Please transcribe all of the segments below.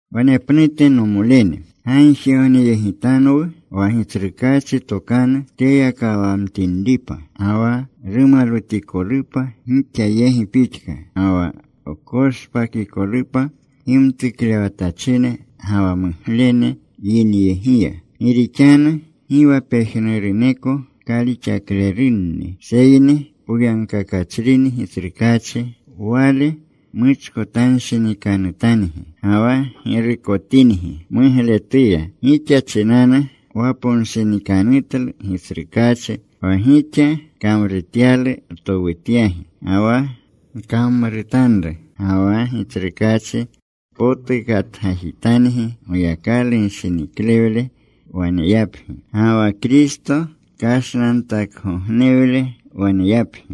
Wanepnute, nomolene, gagjigogneyegitanwu wa Gitsrukaachi tokanu teyakawamtinripa, ga wa rumalwutikolupa gixa yegi pixka. Ga wa wkoshpakikolupa gimtuklewatachine ga wa muglene yineyegiya. Gi rixanu gi wa pejnuruneko kalixaklerunni. Seyni poyagkakachrini Gitsrukaachi; Wale muchkotanshinikanutangi, ga wa girukotingi mugletuya. Gixa chinanu waponshinikanutlu Gitsrukaachi, wa gixa kamrutyalu wtowutyagi, ga wa gkamrutanru. Ga wa Gitsrukaachi potukatgajitangi Goyakalu gishiniklewle waneyapgi, ga wa Kristo kashnantakgognewle waneyapgi.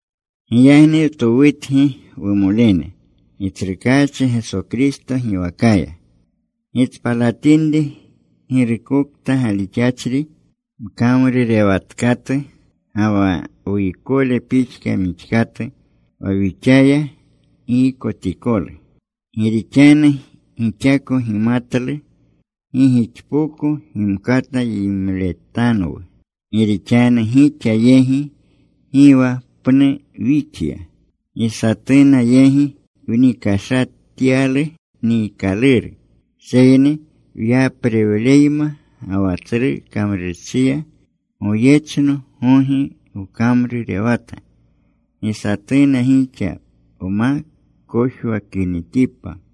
Giyagni wtowutgi, wumolene, Gitsrukaachi Geso Kristo giwakaya, gitspalatinri girukokta galixachri mkamrurewatkatu ga wa wuykole pixka mixkatu wa wixaya giykotikolu. Gi rixanu gixako gimatlu gi gixpoko gimkata yimletanwu, gi rixanu gixa yegi gi wa pnu wixya. Gi satuna yegi wnikashatyalu niikaluru. Seyni wyaprewleyma ga wa tsru kamrurchiya, goyechno gogi wkamrurewata gi satuna gixa wma kojwakinitipa.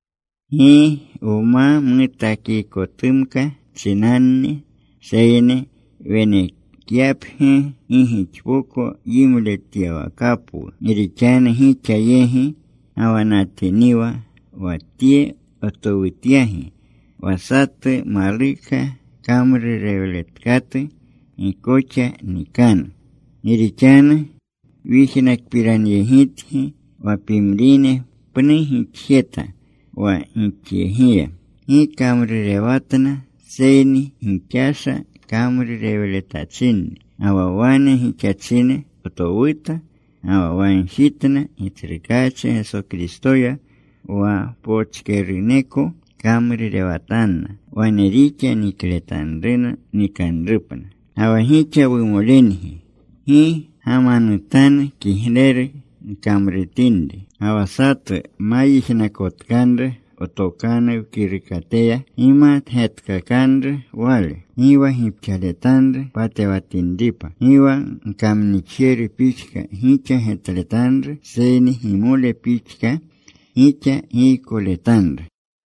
Gi wma mutakikotumka chinanni, seyni, wenekyapgi gi gixpoko yimletyawakapwu. Gi rixanu gixa yegi gawanatiniwa, wa tye wtowutyagi, wa satu maluka kamrurewletkatu gi koxa nikanu. Gi rixanu wyijnakpiranyegitgi wa pimrine pnu gixjeta wa gixyegiya. Gi kamrurewatna, seyni gixasha kamrurewletachinni. Ga wa wane gixachine wtowuta ga wa wagjitna Gitsrukaachi Geso Kristoya wa pochkeruneko kamrurewatanna. Wane rixa nikletanruna nikanrupna. Ga wa gixa, wumolengi, gi gamanutanu kigleru gkamrutinri. Ga wa satu ma yijnakotkanru wtokanu wkirukateya, gimatyegkakanru wale. Gi wa gipxaletanru patewatinripa. Gi wa gkamnixjeru pixka gixa getletanru, seyni gimole pixka gixa giykoletanru.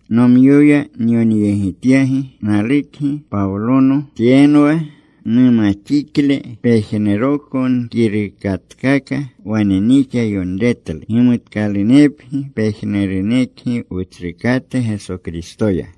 Nomyoya nyonyegityagi: Nalukgi. Pawlono. Tyenwa numaxikle pejnuroko nkirukatkaka. Wane nixa yonretlu. Gimutkalunepgi pejnurunekgi Wutsrukate Geso Kristoya.